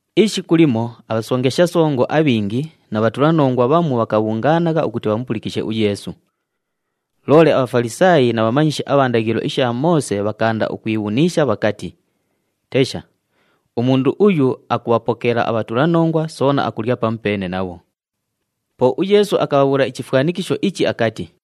Ishiku limo abhasongesha songo abhingi na bhatulanongwa bhamu bhakabhungaanagha ukuti bhamupulikishe uYeesu. Loole aBhafalisaayi na bhamanyishi abha ndaghilo isha Moose bhakaanda ukwibhuniisha bhakati, “Tesha, umundu uyu akubhapokeela abhatulanongwa soona akulya pamupeene nabho!” Po uYeesu akabhabhuula ichifwanikisho ichi akati,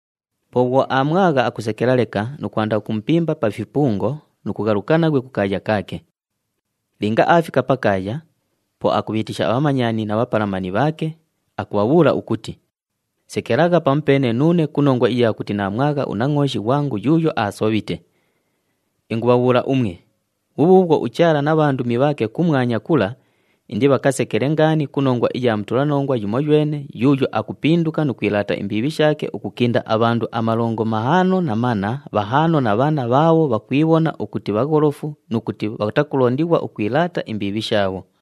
Po bhwo aamwagha, akusekela leka nu kwanda ukumupimba pa fipungo nu kughaluka naghwe kukaaya kaake. Linga aafika pakaaya, po akubhiitisha abhamanyani na bhapalamani bhaake, akubhabhuula ukuti, ‘Sekelagha pamupeene nuune ku nongwa iya kuti naamwagha unangʼooshi ghwangu yuuyo aasobhite.’ Ingubhabhuula umwe, bhubhuubhwo uChaala na bhandumi bhaake kumwanya kula indibhakasekele ngaani ku nongwa iya mutulanongwa yumoywene yuuyo akupinduka nu kwilaata imbiibhi shaake ukukinda abhandu amalongo mahaano na manna, bhahaano na bhanna bhaabho bhakwibhona ukuti bhagholofu nu kuti bhatakulondighwa ukwilaata imbiibhi shaabho.”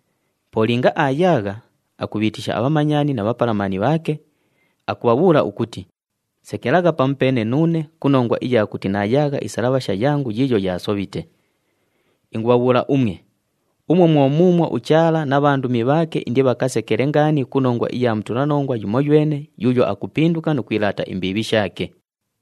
Po linga aayaagha, akubhiitisha abhamanyani na bhapalamani bhaake, akubhabhuula ukuti, ‘Sekelagha pamupeene nuune ku nongwa iya kuti naayaagha isalabhasha yangu yiiyo yaasobhite.’ Ingubhabhuula umwe, umwo mwo muumwo uChaala na bhandumi bhaake indibhakasekele ngaani ku nongwa iya mutulanongwa yumoywene yuuyo akupinduka nu kwilaata imbiibhi shaake.”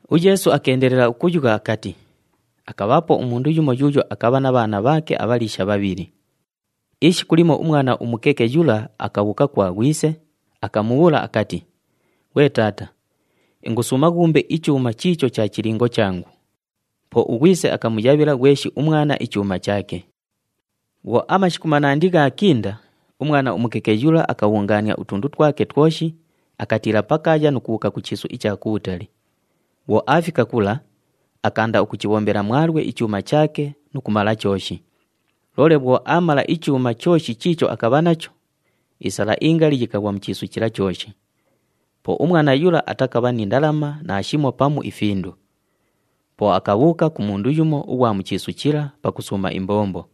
UYeesu akeendelela ukuyugha akati, “Akabhaapo umundu yumo yuuyo akabha na bhaana bhaake abhaliisha bhabhili. Ishiku limo umwana umukeke yula akabhuuka kwa ghwise, akamubhuula akati, ‘Ghwe taata, ingusuuma ghuumbe ichuuma chiicho cha chilingo changu.’ Po ughwise akamuyabhila ghweshi umwana ichuuma chaake. “Bhwo amashiku manandi ghaakinda, umwana umukeke yula akabhungaania utundu twake twoshi, akatiila pakaaya nu kubhuuka ku chiisu icha kubhutali. Bhwo aafika kula, akaanda ukuchibhombela mwalwe ichuuma chaake nu kumala chooshi. Loole bhwo aamala ichuuma chooshi chiicho akabha nacho, isala ingali yikaghwa mu chiisu chila chooshi. Po umwana yula atakabha ni ndalama naashimo pamu ifindu. Po akabhuuka ku mundu yumo ughwa mu chiisu chila pakusuuma imbombo.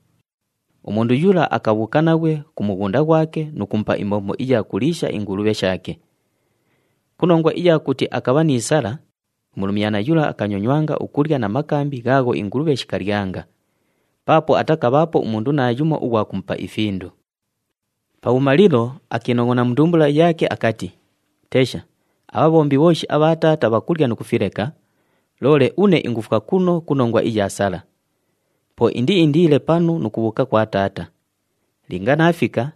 Umundu yula akabhuuka naghwe ku mughunda ghwake nu kumupa imbombo iya kuliisha ingulubhe shaake. Ku nongwa iya kuti akabha ni sala, umulumyana yula akanyonywanga ukulya na makambi ghaagho ingulubhe shikalyanga, paapo atakabhaapo umundu naayumo ughwa kumupa ifindu. “Pabhumalilo, akiinongʼona mu ndumbula yaake akati, ‘Tesha, abhabhombi bhooshi abha taata bhakulya nu kufileka, loole une ingufwa kuno ku nongwa iya sala! Po indiindiile panu nu kubhuuka kwa taata. Linga naafika,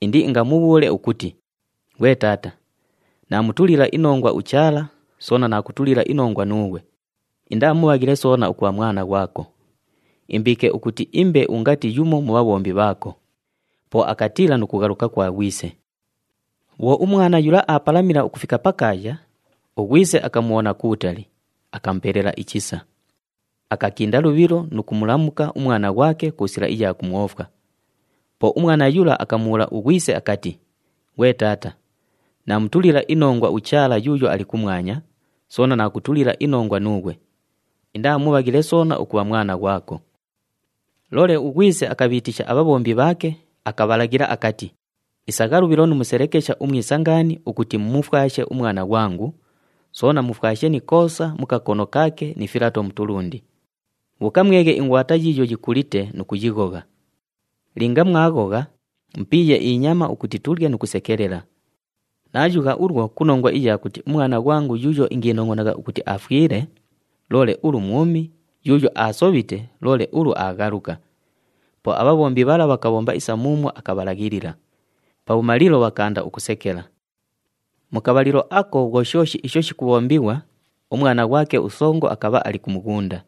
indiingamubhuule ukuti, “Ghwe taata, naamutulila inongwa uChaala, soona naakutulila inongwa nuughwe. Indaa mubhaghile soona ukubha mwana ghwako. Imbiike ukuti imbe ungati yumo mu bhabhombi bhaako.” ’ Po akatiila nu kughaluka kwa ghwise. “Bhwo umwana yula aapalamila ukufika pakaaya, ughwise akamubhona kubhutali, akamupelela ichisa. Akakinda lubhilo nu kumulamuka umwana ghwake ku sila iya kumwofwa. Po umwana yula akamubhuula ughwise akati, ‘Ghwe taata, naamutulila inongwa uChaala yuuyo ali kumwanya, soona naakutulila inongwa nuughwe. Indaa mubhaghile soona ukubha mwana ghwako.’ “Loole ughwise akabhiitisha abhabhombi bhaake, akabhalaghila akati, ‘Isagha lubhilo nu muselekesha umwisa ngaani ukuti mumufwashe umwana ghwangu, soona mufwashe ni ikoosa mu kakono kaake ni filato mu tulundi. Bhuuka mweghe ingwata yiiyo yikulite nu kuyighogha. Linga mwaghogha, mupiiye inyama ukuti tulye nu kusekelela. Naayugha ulwo ku nongwa iya kuti umwana ghwangu yuuyo ingiinongʼonagha ukuti afwile, loole ulu mwumi, yuuyo aasobhite, loole ulu aaghaluka!’ Po abhabhombi bhala bhakabhomba isa muumwo akabhalaghilila. Pabhumalilo, bhakaanda ukusekela. “Mu kabhalilo ako bhwo shooshi isho shikubhombighwa, umwana ghwake usongo akabha ali ku mughunda.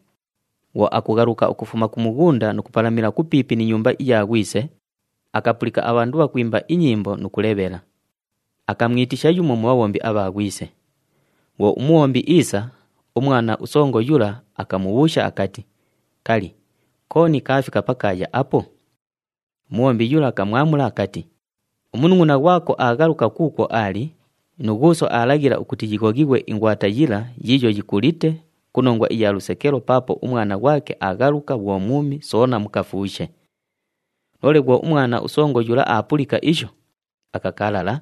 Bhwo akughaluka ukufuma ku mughunda nu kupalamila kupiipi ni nyumba iya ghwise, akapulika abhandu bhakwimba inyimbo nu kulebhela. Akamwitisha yumo mu bhabhombi abha ghwise. Bhwo umubhombi iisa, umwana usongo yula akamubhuusha akati, ‘Kali, kooni kaafika pakaaya apo?’ Umubhombi yula akamwamula akati, ‘Umunungʼuna ghwako aaghaluka kuukwo aali, nu ghuuso aalaghila ukuti yighoghighwe ingwata yila yiiyo yikulite ku nongwa iya lusekelo paapo umwana ghwake aaghaluka bhwo mwumi soona mukafuushe.’ Loole bhwo umwana usongo yula aapulika isho, akakalala,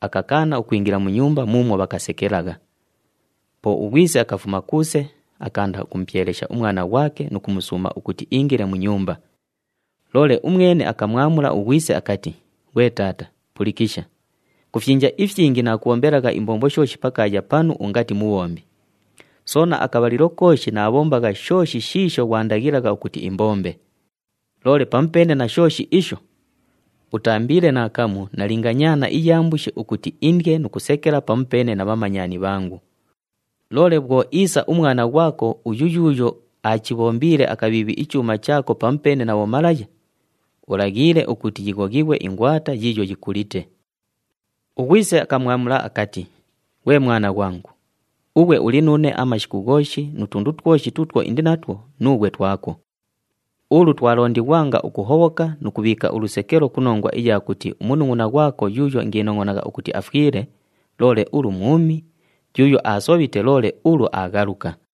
akakaana ukwingila mu nyumba muumwo bhakasekelagha. Po ughwise akafuma kuuse, akaanda ukumupyelesha umwana ghwake nu kumusuuma ukuti iingile mu nyumba. Loole umwene akamwamula ughwise akati, ‘Ghwe taata, pulikisha! Ku fyinja ifyingi naakubhombelagha imbombo shooshi pakaaya panu ungati mubhombi, soona akabhalilo kooshi naabhombagha shooshi shiisho ghwandaghilagha ukuti imbombe! Loole pamupeene na shooshi isho, utaambiile naakamu nalinga nyaana iya mbushi ukuti indye nu kusekela pamupeene na bhamanyani bhangu. Loole bhwo iisa umwana ghwako uyu yuuyo aachibhombiile akabhiibhi ichuuma chaako pamupeene na bhomalaya, ulaghiile ukuti yighoghighwe ingwata yiiyo yikulite!’ “Ughwise akamwamula akati, ‘Ghwe mwana ghwangu, ughwe uli nuune amashiku ghooshi nu tundu twoshi tuutwo indi natwo, nuughwe twako. Ulu twalondighwanga ukuhobhoka nu kubhiika ulusekelo ku nongwa iya kuti umunungʼuna ghwako yuuyo ingiinongʼonagha ukuti afwile, loole ulu mwumi, yuuyo aasobhite, loole ulu aaghaluka!’”